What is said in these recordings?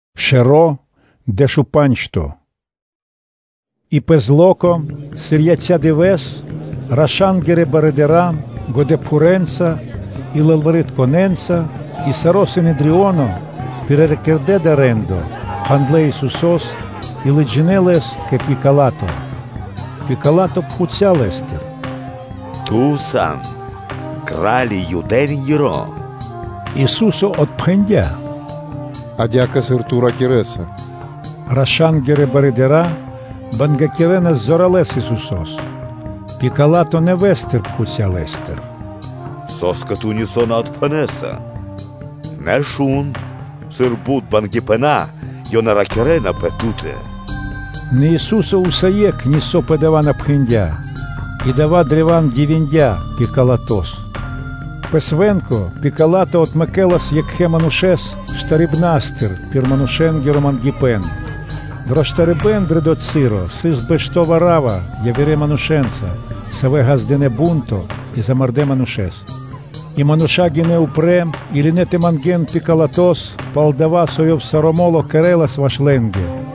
И екха́тыр (сра́зу) пэ зло́ко, сыр яця́ дывэ́с, раша́нгирэ барыдыра́ годэпхурэнца и лылваритконэнца и саро́ Синедрионо пириракирдэ дава́ рэ́ндо, пхандлэ Исусо́с и лыджинэ́ Лэс кэ Пила́то. Пила́то пхуця́ Лэ́стыр: “Ту сан Кра́ли Юдэ́нгиро?” Ису́со отпхэндя́, – “адя́кэ, сыр ту ракирэ́са.” Раша́нгирэ барыдыра́ бангякирэнас зоралэ́с Исусо́с. Пила́то нэвэ́стыр пхуця́ Лэ́стыр: “Со́скэ Ту нисо́ на отпхэнэса? Нэ, шун, сыр бут бангипэна ёнэ ракирэ́на пэ Ту́тэ?” Нэ Ису́со усае́кх нисо́ пэ дава́ на пхэндя́, и дава́ древа́н дивиндя Пилатос. Пэ свэ́нко Пила́то отмэкэлас екхэ манушэ́с штарибнастыр (бэшыбнастыр) пир манушэ́нгиро мангипэ́н. Дро штарибэ́н дро дова́ часо сыс бэшто́ Варава явирэ манушэ́нца, савэ́ ґаздынэ́ бу́нто и замардэ́ манушэ́с. И мануша́ гинэ́ упрэ́ и лынэ́ тэ мангэ́н Пилатос пал дава́, со ёв саро́ мо́ло кэрэ́лас ваш лэ́нгэ.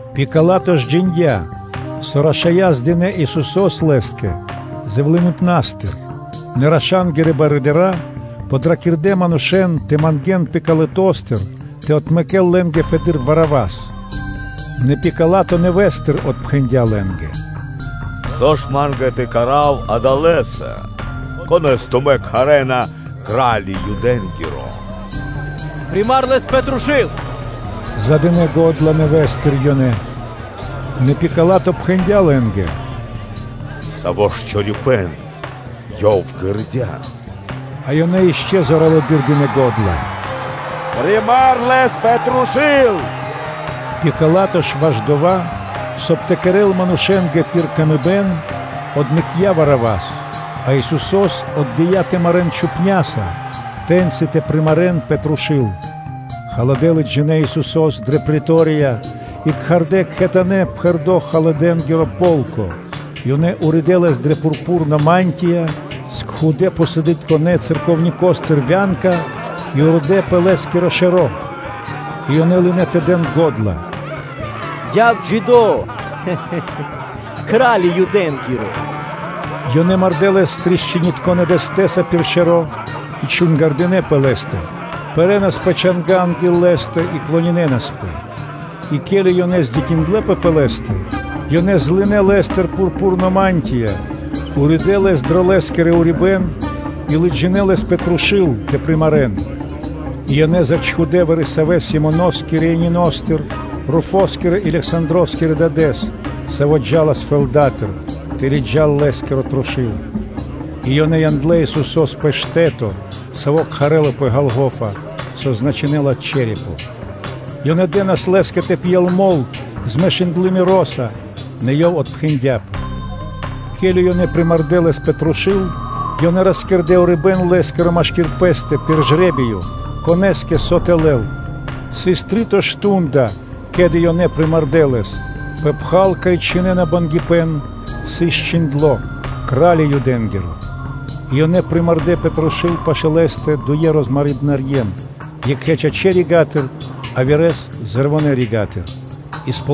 Пила́то ж джиндя́, со рашая́ здынэ Исусо́с лэ́скэ зэвлыныпнастыр. Нэ раша́нгирэ барыдыра́ подракирдэ манушэ́н тэ мангэ́н Пилатостыр тэ отмэкэ́л лэ́нгэ фэды́р Варавас. Нэ Пила́то нэвэ́стыр отпхэндя́ лэ́нгэ: “Со ж Ма́нгэ тэ кэра́в Адалэса, Конэ́с тумэ́ кхарэ́на “Кра́ли Юдэ́нгиро?” “Примар Лэс пэ трушу́л!”, – задынэ го́дла нэвэ́стыр ёнэ. Нэ Пила́то пхэндя́ лэ́нгэ: “Саво́ ж чорипэ́н Ёв кэрдя́?” А ёнэ ишчо (инкэ́) зоралэды́р дынэ́ го́дла: “Примар Лэс пэ трушу́л!” Пила́то ж ваш дова́, соб (кай) тэ кэрэ́л манушэ́нгэ пир ило́, отмэкця́ Варавас, а Исусо́с отдыя́ тэ марэ́н чупняса, тэ́ньчи тэ примарэн пэ трушу́л. Халадэ́ лыджинэ́ Исусо́с дрэ претория и кхардэ́ кхэтанэ́ пхэрдо́ халадэ́нгиро полко. Ёнэ уридэ́ Лэс дрэ пурпурно мантия, скхудэ пхусадытконэ церновникостыр вя́нка и уридэ́ пэ Лэ́скиро шэро́. И ёнэ лынэ́ тэ дэн го́дла: “Яв джидо́, Кра́лё Юдэ́нгиро!” Ёнэ мардэ́ Лэс трасцинитконэ дэстэса пир шэро́ и чунгардынэ пэ Лэ́стэ, пэрэнас пэ чанга́ анги́л Лэ́стэ и клонинэнаспэ. И ке́ли ёнэ высандлэ холямэс Лэс, ёнэ злынэ Лэ́стыр пурпурно мантия, уридэ́ Лэс дро Лэ́скиро урибэ́н, и лыджинэ́ Лэс пэ трушу́л тэ примарэн. И ёнэ зачхудэ вари-савэ́ Симонос Кириянинос, Руфоскирэ и Лександроскирэ дадэ́с, саво́ джа́лас фэлдатыр, тэ лыджа́л Лэ́скиро трушу́л. И ёнэ яндлэ́ Исусо́с пэ штэ́то, саво́ кхарэ́лапэ “Голгофа”, со значынэ́ла “Чэрепо.” Ёнэ дэ́нас Лэ́скэ тэ пьел мол (вино), змешындлы миро́са, нэ Ёв отпхэндяпэ. Ке́ли ёнэ примардэ Лэс пэ трушу́л, ёнэ роскэрдэ (росчхудэ) урибэ́н Лэ́скиро машки́р пэ́стэ пир жре́биё, конэ́скэ со тэ лэл. Сыс три́то мардо́ (шту́нда), ке́ли ёнэ примардэ Лэс. Пэ пхал, кай чхинэна бангипэн, сыс чхиндло́: “Кра́ли Юдэ́нгиро.” И ёнэ примардэ пэ трушу́л пашы́л Лэ́стэ дуе розмарибнарьен, екхэ́с чачэ́ рига́тыр, явирэ́с зэрвонэ (левонэ) рига́тыр. Стихо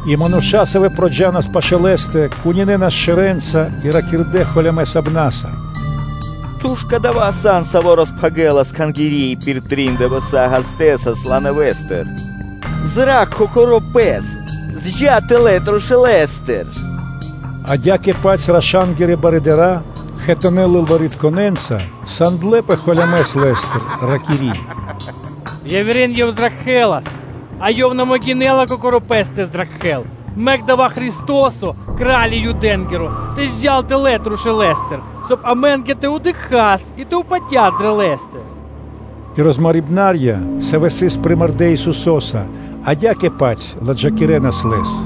И мануша́, савэ́ проджанас пашы́л Лэ́стэ, кунинэнас шэрэнца и ракирдэ́ налачхэ́ лава́: “Ту ж кадава́ сан, Саво́ роспхагирэлас Кхангири́ и пир трин дывэса́ ґаздэсас ла нэвэ́стыр! Ракх Кокоро́ Пэс, джа́ тэлэ́ трушулэстыр.” Адя́кэ-паць раша́нгирэ барыдыра́, кхэтанэ́ лылваритконэнца, сандлэпэ холямэс Лэ́стыр, ракири́: “Явирэ́н Ёв зракхэлас, а Ёв на могинэ́ла Кокоро́ Пэс тэ зракхэ́л! Мэк дава́ Христо́со, Кра́ли Юдэ́нгиро, тэ джал тэлэ́ трушулэстыр, соб (кай) амэ́нгэ тэ дыкхас, и тэ упатяс дрэ Лэ́стэ.” И розмарибнарья, савэ́ сыс примардэ Исусо́са, адя́кэ-паць ладжакирэнас Лэс.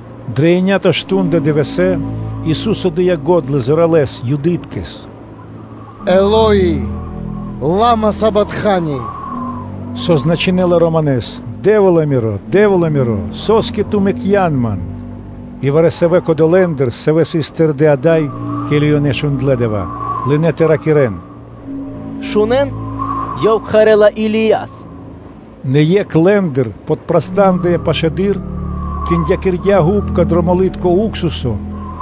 Дро еня́то мардо́ дывэсэ́ Ису́со дыя́ го́дла зоралэ́с Юдыткэс: “Элои́, Элои́ лама савактани?” Со значынэ́ла Романэс: “Дэ́вла Миро, Дэ́вла Миро, со́скэ Ту мэкцян Ман?” И вари-савэ́ кодолэ́ манушэ́ндыр, савэ́ сыс тэрдэ́ ада́й, ке́ли ёнэ шундлэ́ дава́, лынэ́ тэ ракирэ́н: “Шунэ́н, Ёв кхарэ́ла Илияс.” Нэ екх лэ́ндыр подпрастандыя пашылэды́р, киндякирдя гупка дро молитко уксусо,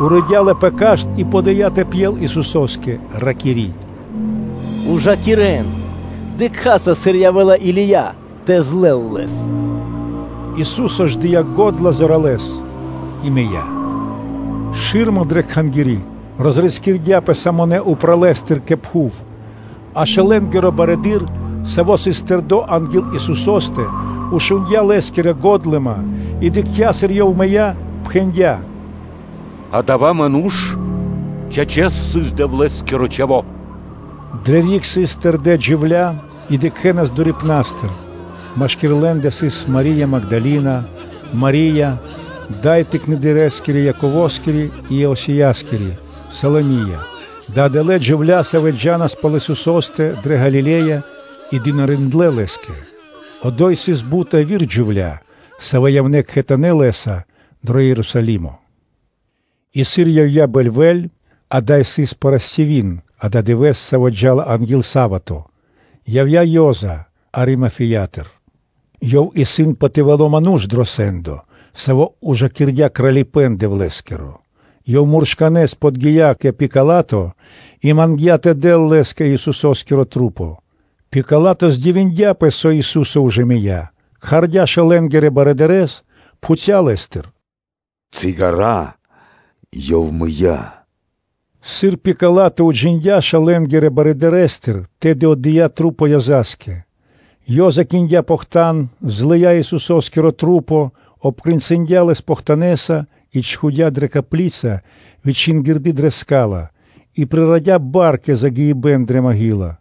уридя ла пэ кашт и подыя тэ пьел Исусо́скэ; ракири́: “Ужакирэн. Дыкхаса, сыр явэ́ла Или́я тэ злэл Лэс.” Ису́со ж, дыя́ го́дла зоралэ́с и мыя́. Шы́рма дрэ Кхангири́ розрискирдяпэ самонэ упралэстыр кэ пхув. А шэлэнгиро барыдыро́, саво́ сыс тэрдо́ анги́л Исусо́стэ, шундя́ Лэ́скири годлыма и дыкхця́, сыр Ёв мыя́, пхэндя́: “Адава́ ману́ш, чачэс, сыс Дэвлэ́скиро Чхаво́!” Дрэ риг сыс тэрдэ́ джувля́ и дыкхэнас дурипнастыр: машки́р лэ́ндэ сыс Мари́я Магдалина, Мари́я, дай Тыкнэдырэскири Яковоскири и Иосияскири, Саломия, дава́ сыс адалэ́ джувля́, савэ́ джа́нас пал Исусо́стэ дрэ Галиле́я и дынариндлэ́ Лэ́скэ; одо́й сыс бут яви́р джувля́, савэ́ явнэ́ кхэтанэ́ Лэ́са дро Ерусалимо. И сыр явдя́ бэльвэ́ль, дава́ сыс парастиви́н (пятница) – дава́ дывэ́с, саво́ джа́ла анги́л са́вато (субо́та), явдя́ Ёза Аримафеятыр. Ёв сыс патывало ману́ш дро сэ́ндо, саво́ ужакирдя Кралипэ́н Дэвлэ́скиро. Ёв муршканэ́с подги́я кэ Пила́то и мангдя́ тэ дэл лэ́скэ Исусо́скиро тру́по. Пила́то здивиндяпэ, со Ису́со ужэ мыя́, кхардя́ шэлэнгирэ барыдырэ́с, пхуця́ лэ́стыр: “Ци ґара́ Ёв мыя́?” Сыр Пила́то уджиндя́ шэлэнгирэ барэдырэстыр, тэды отдыя́ тру́по Ёза́скэ. Ёза киндя похтан, злыя́ Исусо́скиро тру́по; обкрэнцындя Лэс жужэ́ похтанэса и чхудя́ дрэ копли́ца, вычингирды дрэ ска́ла, и прирадя бар кэ загиибэ́н дрэ копли́ца.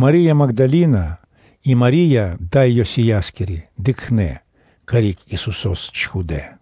Мари́я Магдалина и Мари́я, дай Йосияскири, дыкхнэ́, карик Исусо́с чхудэ́.